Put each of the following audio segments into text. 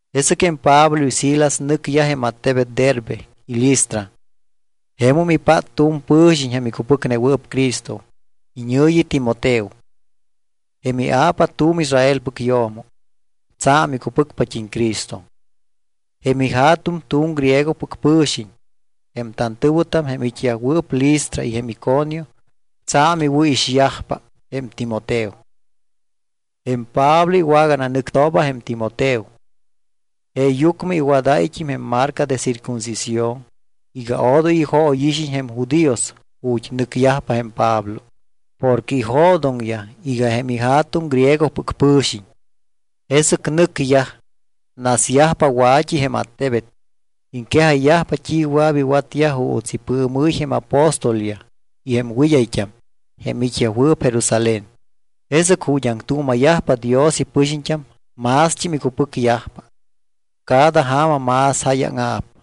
Jesɨc jém Pablo y Silas nɨcyaj jém attebet Derbe y Listra. Jemum ipát tu̱m pɨ̱xiñ jém icupɨcnewɨɨp Cristo iñɨ̱yi Timoteo. Jém ia̱pa tu̱m Israelpɨc yo̱mo, tsa̱m icupɨcpat́im Cristo. Jém ija̱tuŋ tu̱m griegopɨc pɨ̱xiñ. Jém tantɨ̱wɨtam jém it́yajwɨɨp Listra y jém Iconio tsa̱m iwɨ̱ixyajpa jém Timoteo. Jém Pablo iwagananɨctooba jém Timoteo. Jeeyucmɨ iwadáyt́im jém marca de circuncisión iga odoy ijóyixiñ jém judíos ju̱t́ nɨcyajpa jém Pablo. Porque ijo̱doŋyaj iga jém ija̱tuŋ griegopɨc pɨ̱xiñ. Jesɨc nɨcyaj, nasyajpa wa̱t́i jém attebet. Iŋquejayyajpa t́i wɨa̱p iwatyaj juuts ipɨɨmɨ́y jém apóstolyaj y jém wɨd́ayt́am jém it́yajwɨɨp Jerusalén. Jesɨc ju̱t́ aŋtuuma̱yajpa Dios ipɨxiñt́am mást́im icupɨcyajpa. Cada ja̱ma más jáyaŋa̱p.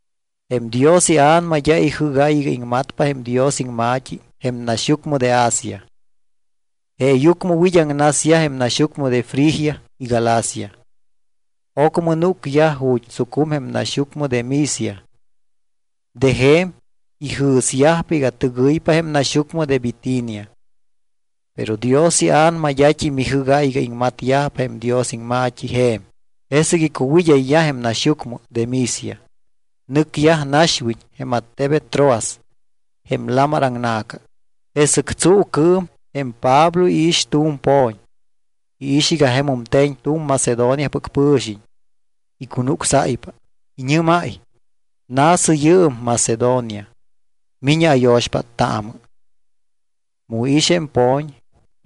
Jém Dios iA̱nama d́a ijɨ́gáy iga iŋmatpa jém Dios iŋma̱t́i jém naxyucmɨ de Asia. Jeeyucmɨ wid́aŋnasyaj jém naxyucmɨ de Frigia y Galacia. Ocmɨ núcyaj ju̱t́ tsucum jém naxyucmɨ de Misia. De je̱m ijɨ̱syajpa iga tɨgɨypa jém naxyucmɨ de Bitinia. Pero Dios iA̱nama d́at́im ijɨ́gáy iga iŋmatyajpa jém Dios iŋma̱t́i je̱m. Jesɨc icuwid́ayyaj jém naxyucmɨ de Misia, nɨcyaj naxwiñ jém attebet Troas jém lamar aŋna̱ca. Jesɨc tsuucɨɨm jém Pablo iix tu̱m po̱ñ. Iix iga jemum te̱ñ tu̱m Macedoniapɨc pɨ̱xiñ. Icunucsáypa. Iñɨ́máy: —Na̱sɨ yɨɨm Macedonia, mi̱ñɨ ayo̱xpáttaamɨ. Mu iix jém po̱ñ,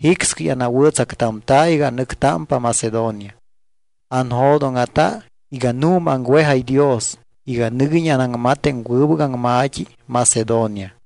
jicscɨy anawɨ̱tsactamta̱ iga anɨctámpa Macedonia. Anjo̱dóŋa̱ta iga nu̱ma aŋwejáy Dios iga nɨguiñ anaŋmat jém wɨbɨc aŋma̱t́i Macedonia.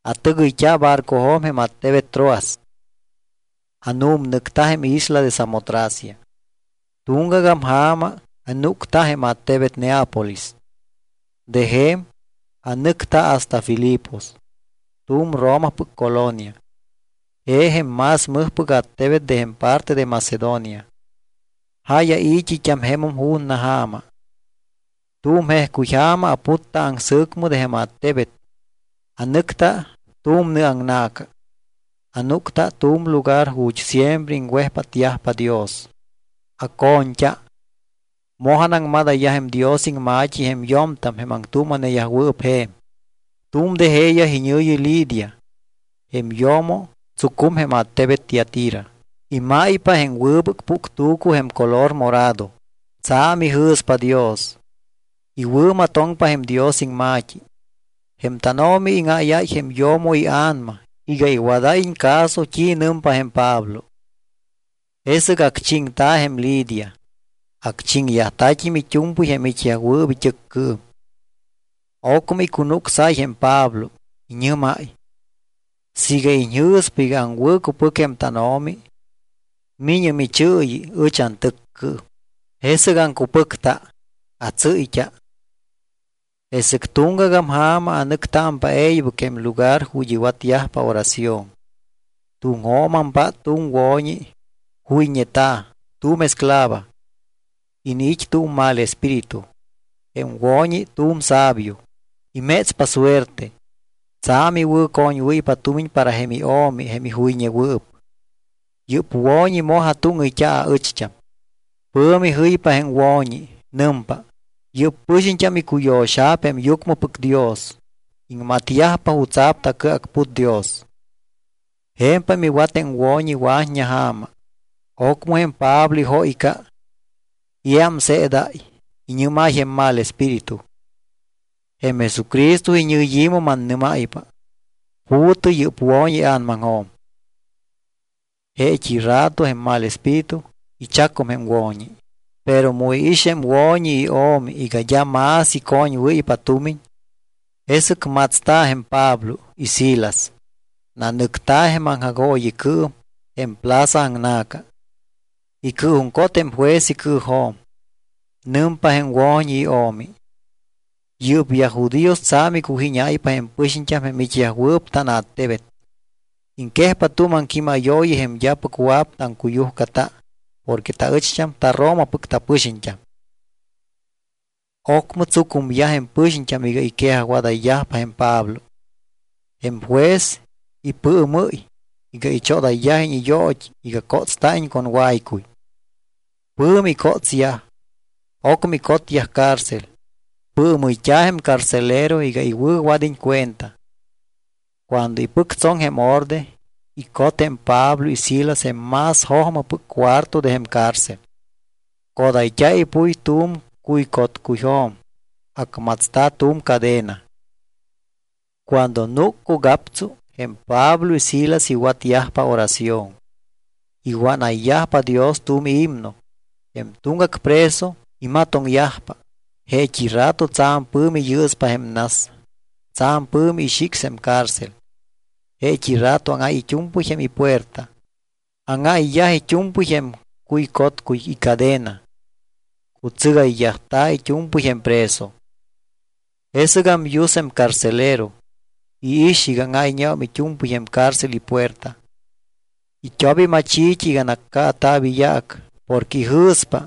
Atɨgɨyt́a barcojo̱m jém attebet Troas. Anu̱mnɨcta jém isla de Samotracia. Tuŋgagam ja̱ma anúcta jém attebet Neápolis. De je̱m anɨcta hasta Filipos, tu̱m Romapɨc colonia. Je jém más mɨjpɨc attebet de jém parte de Macedonia. Jáy ai̱t́it́am jemum ju̱na ja̱ma. Tu̱m jejcuy ja̱ma aputta aŋsɨ̱cmɨ de jém attebet. Anɨcta tu̱m nɨ aŋna̱ca. Anúcta tu̱m lugar ju̱t́ siempre iŋwejpátyajpa Dios. Aco̱ñt́a, moj anaŋmadayyaj jém Dios iŋma̱t́i jém yo̱mtam jém aŋtuuma̱neyajwɨɨp je̱m. Tu̱m de jeeyaj iñɨ̱yi Lidia. Jém yo̱mo tsucum jém attebet Tiatira. Imáypa jém wɨbɨc puctu̱cu jém color morado. Tsa̱m ijɨ̱spa Dios. Iwɨ̱matoŋpa jém Dios iŋma̱t́i. Jém tánO̱mi íŋáyáy jém yo̱mo ia̱nama iga iwadáyiñ caso t́i nɨmpa jém Pablo. Jesɨc acchiŋta̱ jém Lidia. Acchiŋyajta̱t́im it́u̱mpɨy jém it́yajwɨɨp it́ɨccɨɨm. Ocmɨ icunucsáy jém Pablo. Iñɨ́máy: —Siiga iñjɨ̱spa iga aŋwɨ̱cupɨc jém tánO̱mi, mi̱ñɨ michɨɨyi ɨch antɨccɨɨm. Jesɨc aŋcupɨcta, atsɨ́yt́a. Jesɨc tuŋgagam ja̱ma anɨctámpa e̱ybɨc jém lugar ju̱t́ iwatyajpa oración. Tuŋjo̱m ampát tu̱m wo̱ñi juyñeta̱, tu̱m esclava. Iniit́ tu̱m mal espíritu. Jém wo̱ñi tu̱m sabio. Imétspa suerte. Tsa̱m iwɨ̱coñwɨ́ypa tumiñ para jém io̱mi jém ijuyñewɨɨp. Yɨ́p wo̱ñi moj atúŋɨyt́a aɨcht́am. Pɨ̱mi jɨypa jém wo̱ñi, nɨmpa: —Yɨ́p pɨxiñt́am icuyo̱xa̱p jém yucmɨpɨc Dios. Iŋmatyajpa jutsa̱p tacɨacput Dios. Je̱mpam iwat jém wo̱ñi wa̱t́ña ja̱ma. Ocmɨ jém Pablo ijóyca. Iámseedáy, iñɨ́máy jém mal espíritu: —Jém Jesucristo iñɨyi̱mɨ mannɨ́máypa, pu̱tɨ yɨ́p wo̱ñi ia̱namaŋjo̱m. Jeet́i rato jém mal espíritu ichacum jém wo̱ñi. Pero mu iix jém wo̱ñi io̱mi iga d́a más icoñwɨ́ypa tumiñ, jesɨc matsta̱ jém Pablo y Silas. Nanɨcta̱ jém aŋjagooyicɨɨm jém plaza aŋna̱ca. Icɨɨjuŋcot jém juez icɨɨjo̱m. Nɨmpa jém wo̱ñi io̱mi: —Yɨ́pyaj judíos tsa̱m iccujíñáypa jém pɨxiñt́am jém it́yajwɨɨp tánattebet. Iŋquejpa tu̱m aŋquímayooyi jém d́apɨc wɨa̱p taŋcuyujcata porque taɨcht́am taRomapɨc tapɨxiñt́am. Ocmɨ tsucumyaj jém pɨxiñt́am iga iquejajwadayyajpa jém Pablo. Jém juez ipɨɨmɨ́y iga ichodayyajiñ iyoot́i iga cótsta̱iñ con waycuy. Pɨ̱mi icótsyaj, ocmɨ icotyaj cárcel. Pɨɨmɨyt́a̱ jém carcelero iga iwɨ̱wad́iñ cuenta. Cuando ipɨctsoŋ jém orde, icot jém Pablo y Silas jém más jojmɨpɨc cuarto de jém cárcel. Codayt́a̱ ipuy tu̱m cuycotcuyjo̱m, acmatsta̱ tu̱m cadena. Cuando núc cugaptsu, jém Pablo y Silas iwatyajpa oración; iwánayyajpa Dios tu̱m himno. Jém tuŋgac preso imatoŋyajpa. Jeet́i rato tsa̱m pɨ̱mi yɨɨspa jém nas. Tsa̱m pɨ̱mi ixics jém cárcel. Jeet́i rato áŋáy it́u̱mpɨy jém ipuerta. Áŋáyyaj it́u̱mpɨy jém cuycotcuy icadena, cutsɨgayyajta̱ it́u̱mpɨy jém preso. Jesɨgam yus jém carcelero. Iix iga áŋáyñeum it́u̱mpɨy jém cárcel ipuerta. It́op imachi̱t́i iga nacaata̱p iyaac porque ijɨ̱spa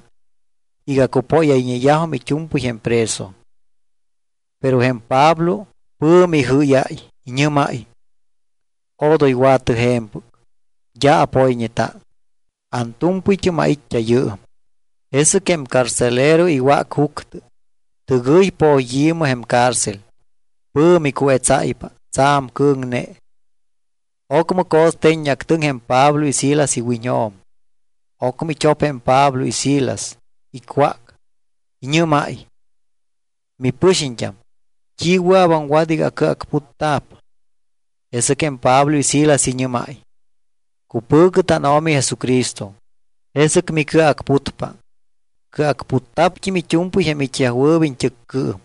iga cupóyayñeyajum it́u̱mpɨy jém preso. Pero jém Pablo pɨ̱mi ijɨ́yáy. Iñɨ́máy: —Odoy wa̱tɨ je̱mpɨc. D́a apoyñeta, antu̱mpɨyt́am ait́t́a yɨɨm. Jesɨc jém carcelero iwác juctɨ. Tɨgɨy poyi̱mɨ jém cárcel. Pɨ̱mi cuetsáypa, tsa̱m cɨ̱ŋne. Ocmɨ co̱ste̱ññeactɨŋ jém Pablo y Silas iwiñjo̱m. Ocmɨ it́op jém Pablo y Silas. Icwác. Iñɨ́máy: —Mipɨxiñt́am, ¿t́i wɨa̱p aŋwat iga acɨacputta̱p? Jesɨc jém Pablo y Silas iñɨ́máy: —Cupɨ̱cɨ tánO̱mi Jesucristo. Jesɨc micɨacputpa, cɨacputta̱pt́im it́u̱mpɨy jém it́yajwɨɨp iñt́ɨccɨɨm.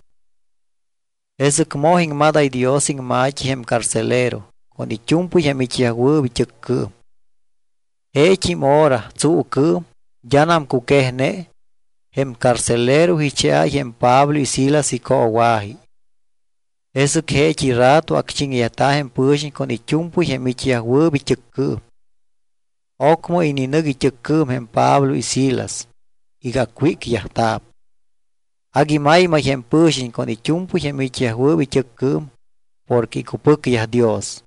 Jesɨc moj iŋmadáy Dios iŋma̱t́i jém carcelero con it́u̱mpɨy jém it́yajwɨɨp it́ɨccɨɨm. Jeet́im hora, tsuucɨɨm, d́anam cuquejne, jém carcelero icheáy jém Pablo y Silas icoowa̱ji. Jesɨc jeet́i rato acchiŋyajta̱ jém pɨ̱xiñ con it́u̱mpɨy jém it́yajwɨɨp it́ɨccɨɨm. Ocmɨ ininɨc it́ɨccɨɨm jém Pablo y Silas iga acwícyajta̱p. Agui maymay jém pɨ̱xiñ con it́u̱mpɨy jém it́yajwɨɨp it́ɨccɨɨm porque icupɨcyaj Dios.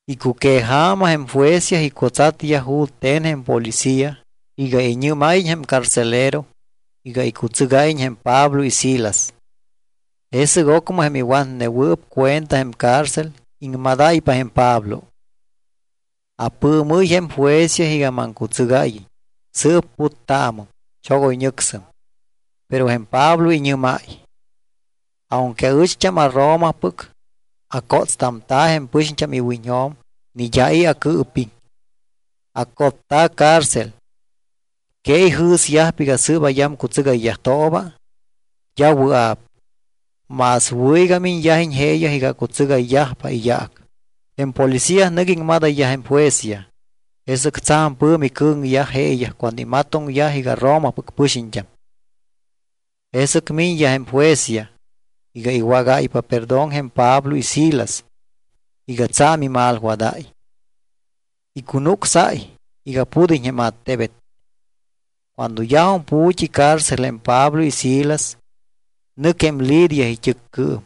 Icuqueja̱ma jém juezyaj icutsatyaj jute̱n jém policía iga iñɨ́máyiñ jém carcelero iga icutsɨgáyiñ jém Pablo y Silas. Jesɨc ocmɨ jém iwatnewɨɨp cuenta jém cárcel iŋmadáypa jém Pablo: —Apɨɨmɨ́y jém juezyaj iga maŋcutsɨgáyiñ. Sɨɨp puttaamɨm. Chogoyñɨcsɨm. Pero jém Pablo iñɨ́máy: —Aunque aɨcht́am aRomapɨc, acótstamta̱ jém pɨxiñt́am iwiñjo̱m ni d́a i̱ acɨɨpiŋ. Acotta̱ cárcel. ¿Que ijɨ̱syajpa iga sɨɨp ayamcutsɨgayyajt́ooba? D́a wɨa̱p. Más wɨ̱ iga miñyajiñ jeeyaj iga acutsɨgayyajpa iyaac. Jém policía nɨc iŋmadayyaj jém juezyaj. Jesɨc tsa̱m pɨ̱mi cɨ̱ŋyaj jeeyaj cuando imatoŋyaj iga Romapɨc pɨxiñt́am. Jesɨc miñyaj jém juezyaj iga iwágáypa perdón jém Pablo y Silas iga tsa̱m imalwadáy. Icunucsáy iga pud́iñ jém attebet. Cuando yajum pu̱t́i cárcel jém Pablo y Silas, nɨc jém Lidia it́ɨccɨɨm.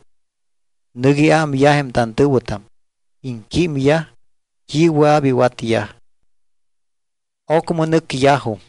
Nɨc iámyaj jém tantɨ̱wɨtam. Iŋquímyaj t́i wɨa̱p iwatyaj. Ocmɨ nɨcyajum.